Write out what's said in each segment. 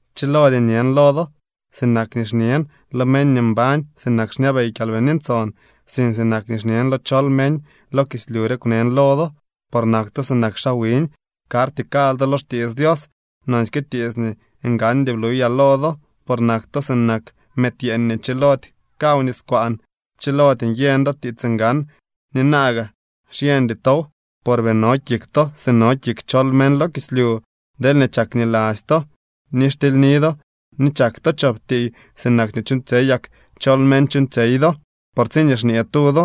Pchilody ñen lo do sinak nii xñen lo meñ nii mbañ sinak xñabey Kyalbini Ntson, sink sinak nii xñen lo chol meñ lo kislyu re kwnen lo do, por nak to sinak xaa wiñ, karty kal do lo xtiits Dios. Nonsyke tiits nii ngandy bluyaa lo do, por nak to sinak mëëd yeeñ nii chilody kaw niskwaan, pchilody nyeñ do tiits ngan ni naa gaa xyeñdy tow, por bii no kik to si no kik chol meñ lo kislyu. Deelñee chakniladzy to, ni xtily do ni chak to chop tiiy sinak nii chuuñtsyey yak chol meñ chuuñtsyey do. Por tsiñee xñee tu do: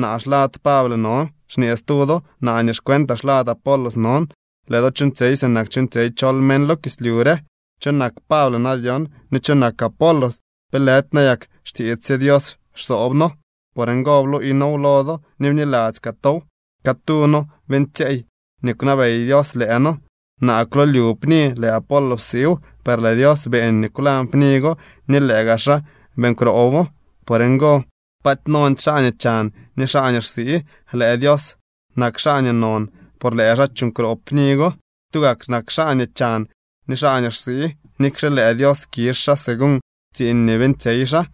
“Naa xlad Pable non”, xñee stu do: “Naa nii xcuentaa xlad Apolos non”, lëë do chuuñtsyey sinak chuuñtsyey chol meñ lo kislyu re. ¿Cho nak Pable na dyon ni cho nak Apolos? ¿Pe lëdy nayak xtiits sye Dios xsoob noo? Por ngo bluuy noow lo do ni bniladzy kaa tow. Catuu noo beeñtsyeey nii kwnabey Dios lëë noo. Naa kwlolyu pni, lëë Apolos psiiw, per lëë Dios beeñ nii kwlañ pni go ni lëë gaa xaa beeñ kroobo. Por ngo paaty nondy xaa nii chan ni xaa nii xsii. Lëë Dios nak xaa nii non por lëë xaa chuuñ kroob pni go. Tugak nak xaa nii chan ni xaa nii xsii, nikxe lëë Dios kizh xaa según tsiiñ nii beeñtsyey xaa.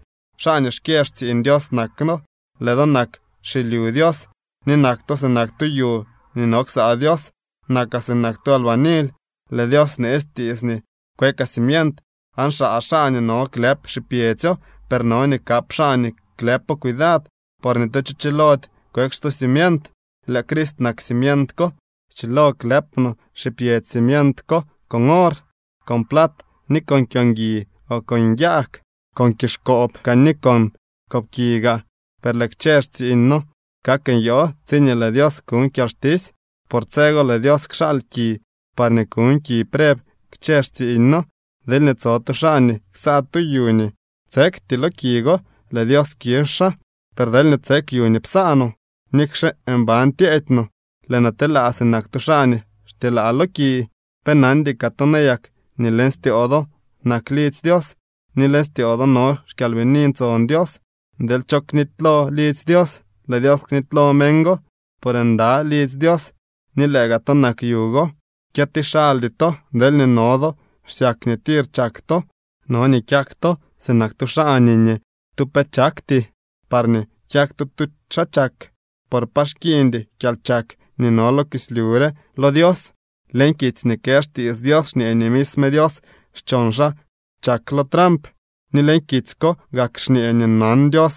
Xaa nii xkyë xtsiiñ Dios nak noo, lëë do nak xilyu Dios. Ni nak to sinak tu yu nii no ksaa Dios. Nakaa sinak tu albanily. Lëë Dios bneetsy tiits nii kwekaa cimient, aan xaa xaa nii no klëp xipyedzyo. Per no nii kap xaa nii klëpo cuidad. Por ni tu cho chilody kweek stu cimient. Lëë Crist nak cimient ko. Schilo klëp no xipyedzy cimiento ko con or, con plat ni con kyo ngui, o con yag, con kizhkoob kaa ni con koobki gaa. Per lëë kchë xtsiiñ no kak nyoo tsiñee lëë Dios kuñ kyalxtisy. Por tse go lëë Dios kxaal ki parñee kuñ ki preb kchë xtsiiñ no. Deelñee tso tu xaa nii ksaa tu yu nii tsekty lo ki go, lëë Dios kizh xaa. Per deelñee tsek yu nii psaa no, nikxe mban tyeedy no, lëë noo telaa sinak tu xaa nii xtyelaa lo ki. ¿Pe nandy kaa to nayak nii leñ styoo do nak lidzy Dios ni leñ styoo do no xKyalbini Ntson Dios? Deel cho knitylo lidzy Dios, lëë Dios knitylo meñ go, por nda lidzy Dios nii lëë gaa to nak yu go. Kyëti xaldy to. Deelñee no do xsyak nii tir chak to, no nii kyak to sinak tu xaa nii ni tu pe chakty parñee kyak to tu xaa chak. Por pa xkiiñdy kyalchak nii no lo kislyu re lo Dios. Leñ kitsy nii kë xtiits Dios xñee nii misme Dios xchon xaa chak lo tramp. Ni leñ kitsy ko gak xñee nii nan Dios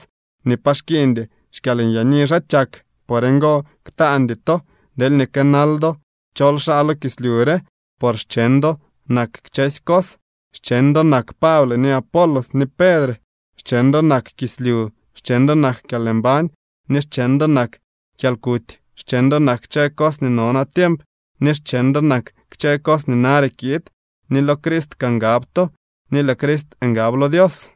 nii pa xkiiñdy xkyalnyaani xaa chak. Por ngo, ktaandy to deelñee kënal do chol xaa lo kislyu re, por xcheñ do nak kchësy cos. Xcheñ do nak Pable ni Apolos ni Pedre. Xcheñ do nak kislyu, xcheñ do nak kyalmbañ ni xcheñ do nak kyalkuty, xcheñ do nak kchë cos nii no natiemp ni xcheñ do nak kchë cos nii nare kiid, ni lo Crist kaa ngab to, ni lëë Crist ngab lo Dios.